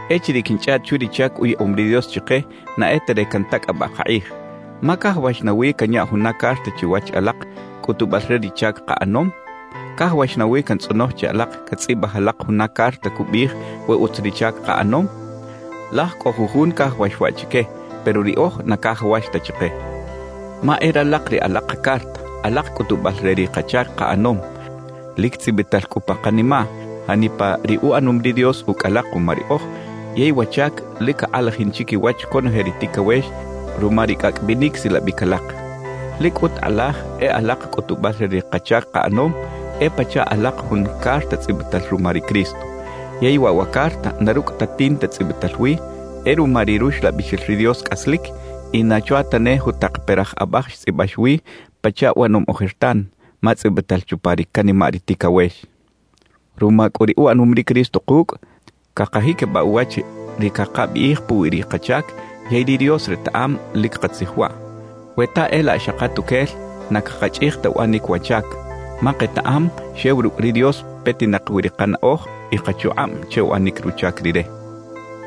Echiriꞌ quinchꞌaꞌt chwi ri chac uyaꞌom ri Dios chike, na e ta re cantacꞌabaꞌ kakꞌij. Ma ¿cajawax nawi canya juna carta chiwach alak, cꞌutubal re ri chac kaꞌanom? ¿Cajawax nawi cantzꞌonoj che alak catzꞌibaj alak juna carta cubiꞌij we utz ri chac kaꞌanom? Laj cꞌo jujun cajawax waꞌ chique, pero riꞌoj na cajawax ta chike; ma e ralak ri alak kacarta, alak cꞌutubal re ri kachac kaꞌanom. Lic tzꞌibital cꞌu pa kanimaꞌ janipa ri uꞌanom ri Dios ucꞌ alak kuma riꞌoj, yey wa chac lic cakꞌalajin chiquiwach conoje ri ticawex ruma ri cꞌacꞌ binic silabic alak. Lic cꞌut kꞌalaj e alak cꞌutubal re ri kachac kaꞌanom, e pachaꞌ alak jun carta tzꞌibital ruma ri Cristo. Yey waꞌ wa carta na rucꞌ ta tinta tzꞌibital wi, e ruma ri Ruxlabixel ri Dios cꞌaslic; y na chwa ta ne jutak peraꞌj abaj xtzꞌibax wi pachaꞌ uꞌanom ojertan, ma tzꞌibital chupa ri canimaꞌ ri ticawex. Ruma cꞌu ri uꞌanom ri Cristo kucꞌ, cakajiquibaꞌ uwach ri cakabiꞌij puwi ri kachac yey ri Dios retaꞌam lic katzij waꞌ. We ta e laꞌ xa katuquel, na cakachꞌij ta uꞌanic wa chac, ma ketaꞌam xew rucꞌ ri Dios petinak wi ri kanaꞌoj y kachukꞌab che uꞌanic ruchac Rire.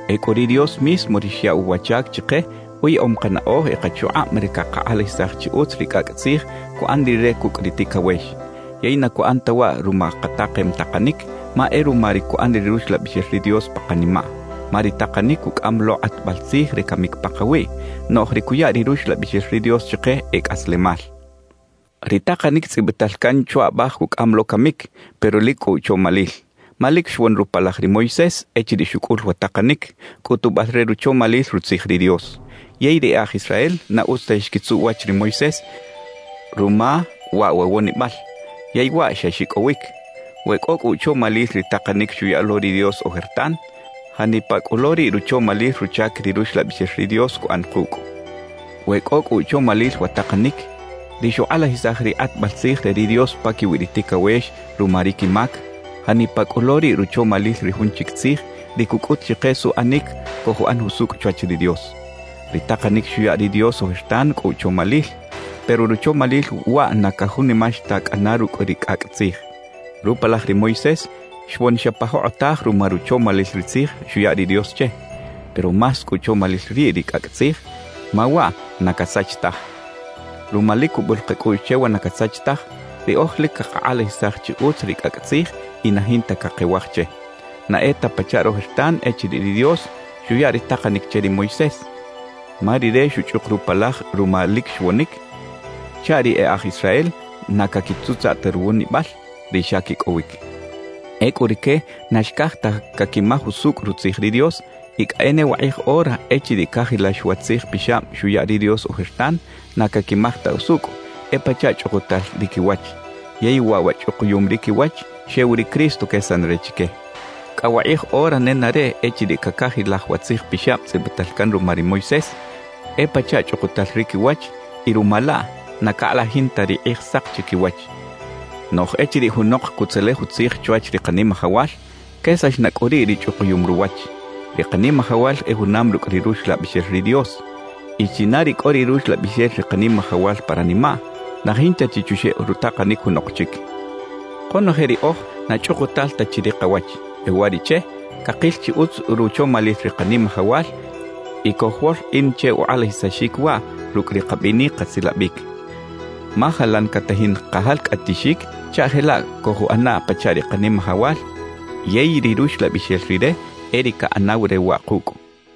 Ecꞌu ri Dios mismo ri xyaꞌw wa chac chike, uyaꞌom kanaꞌoj y kachukꞌab re cakakꞌalajisaj chi utz ri cꞌacꞌ tzij cuꞌan Rire cucꞌ ri ticawex. Yey na cuꞌan ta waꞌ ruma katakem takanic, ma e ruma ri cuꞌan ri Ruxlabixel ri Dios pa kanimaꞌ. Ma ri takanic cucꞌam lo kꞌatbal tzij re camic pakawiꞌ, noꞌj ri cuya ri Ruxlabixel ri Dios chike e cꞌaslemal. Ri takanic tzꞌibital can chwa abaj cucꞌam lo camic, pero lic cꞌo uchomalil. Ma lic xwon rupalaj ri Moisés echiriꞌ xucꞌul wa takanic, cꞌutubal re ruchomalil Rutzij ri Dios. Yey ri e aj Israel na utz ta xquitzuꞌ uwach ri Moisés ruma waꞌ wa wonibal, yey waꞌ xa xicꞌowic. We cꞌo cꞌu uchomalil ri takanic xuya lo ri Dios ojertan, ¡janipa cꞌu lo riꞌ ruchomalil ruchac ri Ruxlabixel ri Dios cuꞌan kucꞌ! We cꞌo cꞌu uchomalil wa takanic, ri xukꞌalajisaj ri kꞌatbal tzij re ri Dios paquiwi ri ticawex ruma ri quimac, ¡janipa cꞌu lo riꞌ ruchomalil ri jun chic tzij, ri cucꞌut chike suꞌanic cojuꞌan jusucꞌ chwach ri Dios! Ri takanic xuya ri Dios ojertan cꞌo uchomalil, pero ruchomalil waꞌ na cajunimax ta cꞌana rucꞌ ri cꞌacꞌ tzij. Rupalaj ri Moisés xwon xa pa jokꞌotaj ruma ruchomalil ri Tzij xuya ri Dios che; pero ¡más cꞌo uchomalil riꞌ ri cꞌacꞌ tzij, ma waꞌ na casach taj! Ruma lic cubul kacꞌuꞌx che wa na casach taj, riꞌoj lic cakakꞌalajisaj chi utz ri cꞌacꞌ tzij y na jinta cakewaj che. Na e ta pachaꞌ rojertan echiriꞌ ri Dios xuya ri takanic che ri Moisés, ma rire xuchꞌuk rupalaj ruma lic xwonic, chaꞌ ri e aj Israel na caquitzutzaꞌ ta ruwonibal, ri xa quicꞌowic. Ecꞌu rique na xcaj ta caquimaj usucꞌ Rutzij ri Dios y cꞌa e ne wakꞌij ora echiriꞌ cacajilaj wa Tzij Pixab xuya ri Dios ojertan, na caquimaj ta usucꞌ; e pachaꞌ chꞌukutal ri quiwach. Yey waꞌ wa chꞌukuyum ri quiwach, xew ri Cristo quesan re chique. Cꞌa wakꞌij ora nenareꞌ echiriꞌ cacajilaj wa Tzij Pixab tzꞌibital can ruma ri Moisés, e pachaꞌ chꞌukutal ri quiwach y ruma laꞌ na cakꞌalajin ta ri Kꞌijsak chiquiwach. Noꞌj echiriꞌ junok cutzelej utzij chwach ri Kanimajawal, quesax na cꞌu riꞌ ri chꞌukuyum ruwach. Ri Kanimajawal e junam rucꞌ ri Ruxlabixel ri Dios; y china ri cꞌo ri Ruxlabixel ri Kanimajawal pa ranimaꞌ, na jinta chi chuxeꞌ rutakanic junok chic. Konoje riꞌoj na chꞌukutal ta chi ri kawach. E uwariꞌche, cakil chi utz ruchomalil ri Kanimajawal y cojwolkꞌin che ukꞌalajisaxic waꞌ rucꞌ ri kabinic kasilabic. Ma jalan catajin kajalcꞌatixic chaꞌ jelaꞌ cojuꞌana pachaꞌ ri Kanimajawal. Yey ri Ruxlabixel Rire e ri caꞌanaw re waꞌ kucꞌ.